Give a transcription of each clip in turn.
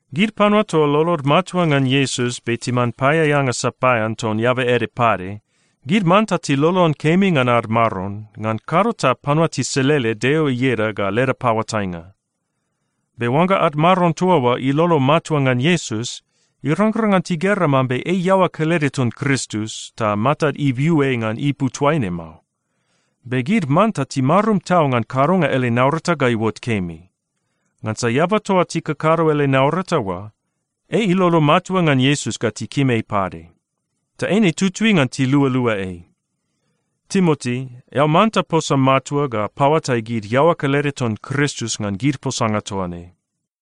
Gid panua toa lolod matua ngan Iesus be timan paeaeanga sapaean ton eaba ede pade, gid manta tilolon kemi ngan ad maron, ngan kado ta panua tiselele Deo ieda ga leda paoatainga. Be oangga ad maron toa oa ilolo matua ngan Iesus, irangrang ngan tigera mambe ei iaoa kelede ton Kristus, ta matad ibiu ei ngan ipu toaine mao. Be gid manta timarum tau ngan kadonga ele naurata ga iuot kemi. Ngansa eaba toa tikakado ele naurata oa, ei ilolo matua ngan Iesus ga tikim ei pade. Ta eine tutui ngan tilualua ei. Timoti, eao manta posa matua ga paoatai gid iaoa kelede ton Kristus ngan gid posanga toa ne.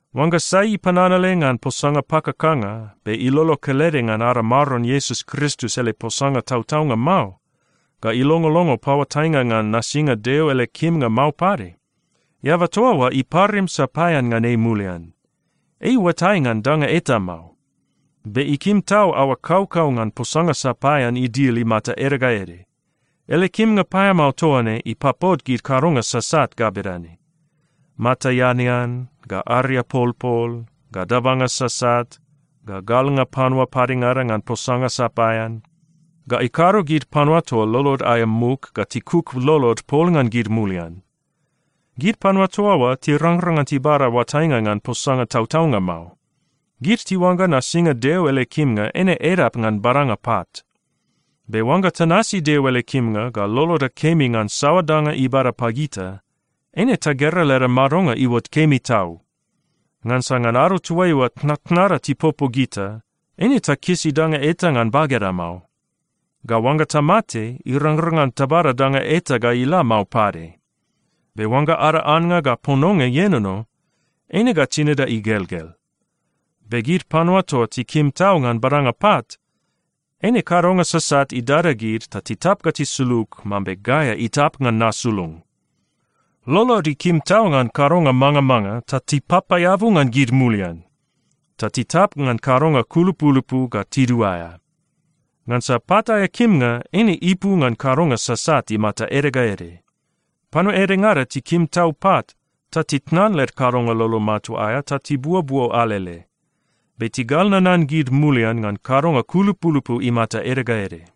Oangga sai ipananale ngan posanga pakakanga, be ilolo kelede ngan ada Maron Iesus Kristus ele posanga tautaunga mao, ga ilongolongo paoatainga ngan nasinga Deo ele kimnga mao pade, eaba toa oa iparim sapaean ngan ei mulian. Ei iuatai ngan danga eta mao. Be ikim tau aoa kaukau ngan posanga sapaean idil imata ede ga ede. Ele kimnga paeamao toa ne ipapot gid kadonga sasat ga bedane: mata eanean, ga ariapolpol, ga dabanga sasat, ga galnga panua padengada ngan posanga sapaean, ga ikado gid panua toa lolod aea muk ga tikuk lolod pol ngan gid mulian. Gid panua toa oa tirangrang ngan tibada oatainga ngan posanga tautaunga mao. Gid tiuangga nasinga Deo ele kimnga eine edap ngan badanga pat. Be oangga tanasi Deo ele kimnga ga loloda kemi ngan saoa danga ibada pagita, eine tagera leda madonga iuot kemi tau. Ngansa ngan ado toaiua tnatnada tipopo gita, eine takisi danga eta ngan bageda mao. Ga oangga tamate, irangrang ngan tabada danga eta ga ila mao pade. Be oangga ada annga ga pononga ienono, eina ga tinida igelgel. Be gid panua toa tikim tau ngan badanga pat, eine kadonga sasat idada gid ta titap ga tisulug mambe gaea itap ngan nasulung. Lolod ikim tau ngan kadonga mangamanga ta tipapaeabu ngan gid mulian, ta titap ngan kadonga kulupulupu ga tiduaea. Ngansa pat aea kimnga eine ipu ngan kadonga sasat imata ede ga ede. Panua edengada tikim tau pat, ta titnan led kadonga lolo matua aea ta tibuobuo alele, be tigal nanan gid mulian ngan kadonga kulupulupu imata ede ga ede.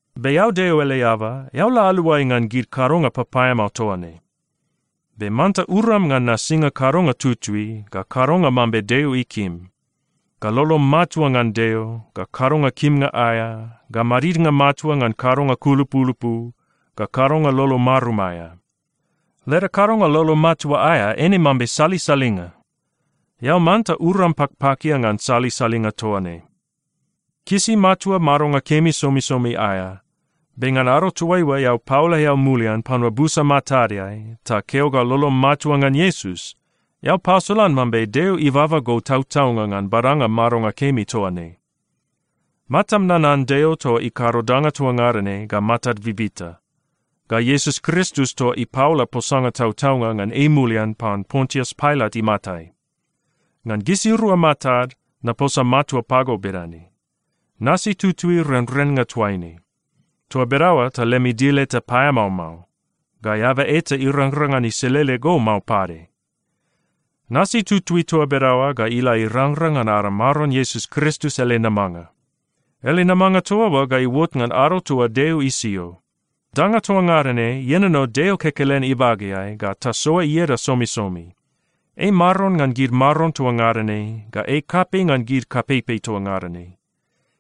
Be eao Deo ele eaba, eao la aluai ngan gid kadonga papaeamao toa ne. Be manta uram ngan nasinga kadonga tutui, ga kadonga mambe Deo ikim, ga lolom matua ngan Deo, ga kadonga kimnga aea, ga madidnga matua ngan kadonga kulupulupu, ga kadonga lolo marum aea. Leda kadonga lolo matua aea eine mambe salisalinga. Eao manta uram pakpakia ngan salisalinga toa ne. Kisi matua madonga kemi somisomi aea. Be ngan ado toaiua eao paola eao mulian panua busa matadeai ta keo ga lolom matua ngan Iesus, eao pasolan mambe Deo ibaba go tautaunga ngan badanga madonga kemi toa ne. Matam nanan Deo toa ikado danga toa ngada ne ga matad bibita, ga Iesus Kristus toa ipaola posanga tautaunga ngan ei mulian pan Pontius Pailat imatai. Ngan gisirua matad naposa matua pago bedane: Nasi tutui renrennga toaine. Toa bedaoa ta lem idil eta paeamao mao, ga eaba eta irangrang ngan iselele go mao pade. Nasi tutui toa bedaoa ga ila irangrang ngan ada Maron Iesus Kristus ele namanga. Ele namanga toa oa ga iuot ngan ado toa Deo isio. Danga toa ngada ne ienono Deo kekelen ibageai ga tasoa ieda somisomi. Ei Maron ngan gid maron toa ngada ne ga ei kapei ngan kapeipei toa ngada ne.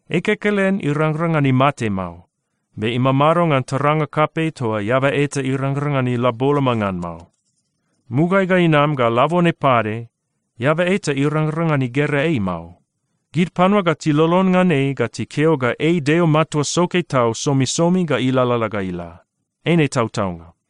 Ei kekelen irangrang ngan imate mao, be imamado ngan taranga kapei toa eaba eta irangrang ngan ila boloma ngan mao. Mugaeai ga inama ga labone pade, eaba eta irangrang ngan igera ei mao. Gid panua ga tilolon ngan ei ga tikeo ga ei Deo matua soke tau somisomi ga ilalala ga ila. Eine tautaunga.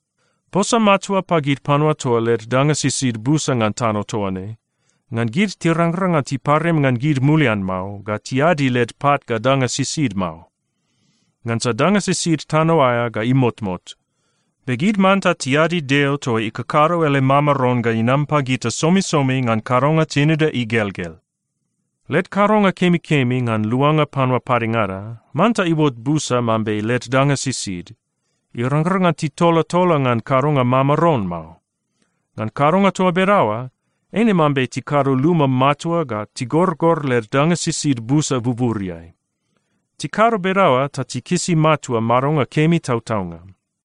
Posa matua pagid panua toa led danga sisid busa ngan tano toa ne, ngan gid tirangrang ngan tiparim ngan gid mulian mao ga tiadi led pat ga danga sisid mao. Ngansa danga sisid tano aea ga imotmot. Be gid manta tiadi Deo toa ikakado ele mamaron ga inam pagita somisomi ngan kadonga tinida igelgel. Led kadonga kemikemi ngan luanga panua padengada manta iuot busa mambe led danga sisid. Irangrang ngan titolatola ngan kadonga mamaron mao. Ngan kadonga toa bedaoa, eine mambe tikado luma matua ga tigorgor led danga sisid busa buburiai. Tikado bedaoa ta tikisi matua madonga kemi tautaunga.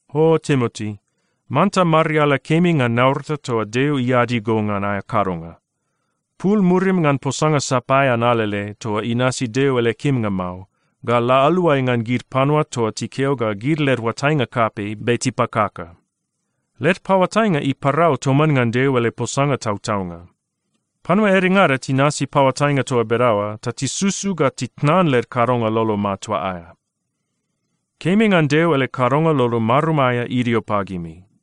O Timoti, manta mariala kemi ngan naurata toa Deo iadi go ngan aea kadonga. Pul murim ngan posanga sapaean alele toa inasi Deo ele kimnga mao, ga la aluai ngan gid panua toa tikeo ga led oatainga kapei be tipakaka. Led paoatainga iparau toman ngan Deo ele posanga tautaunga. Panua edengada tinasi paoatainga toa bedaoa ta tisusu ga titnan led kadonga lolo matua aea. Kemi ngan Deo ele kadonga lolo marum aea idio pagimi.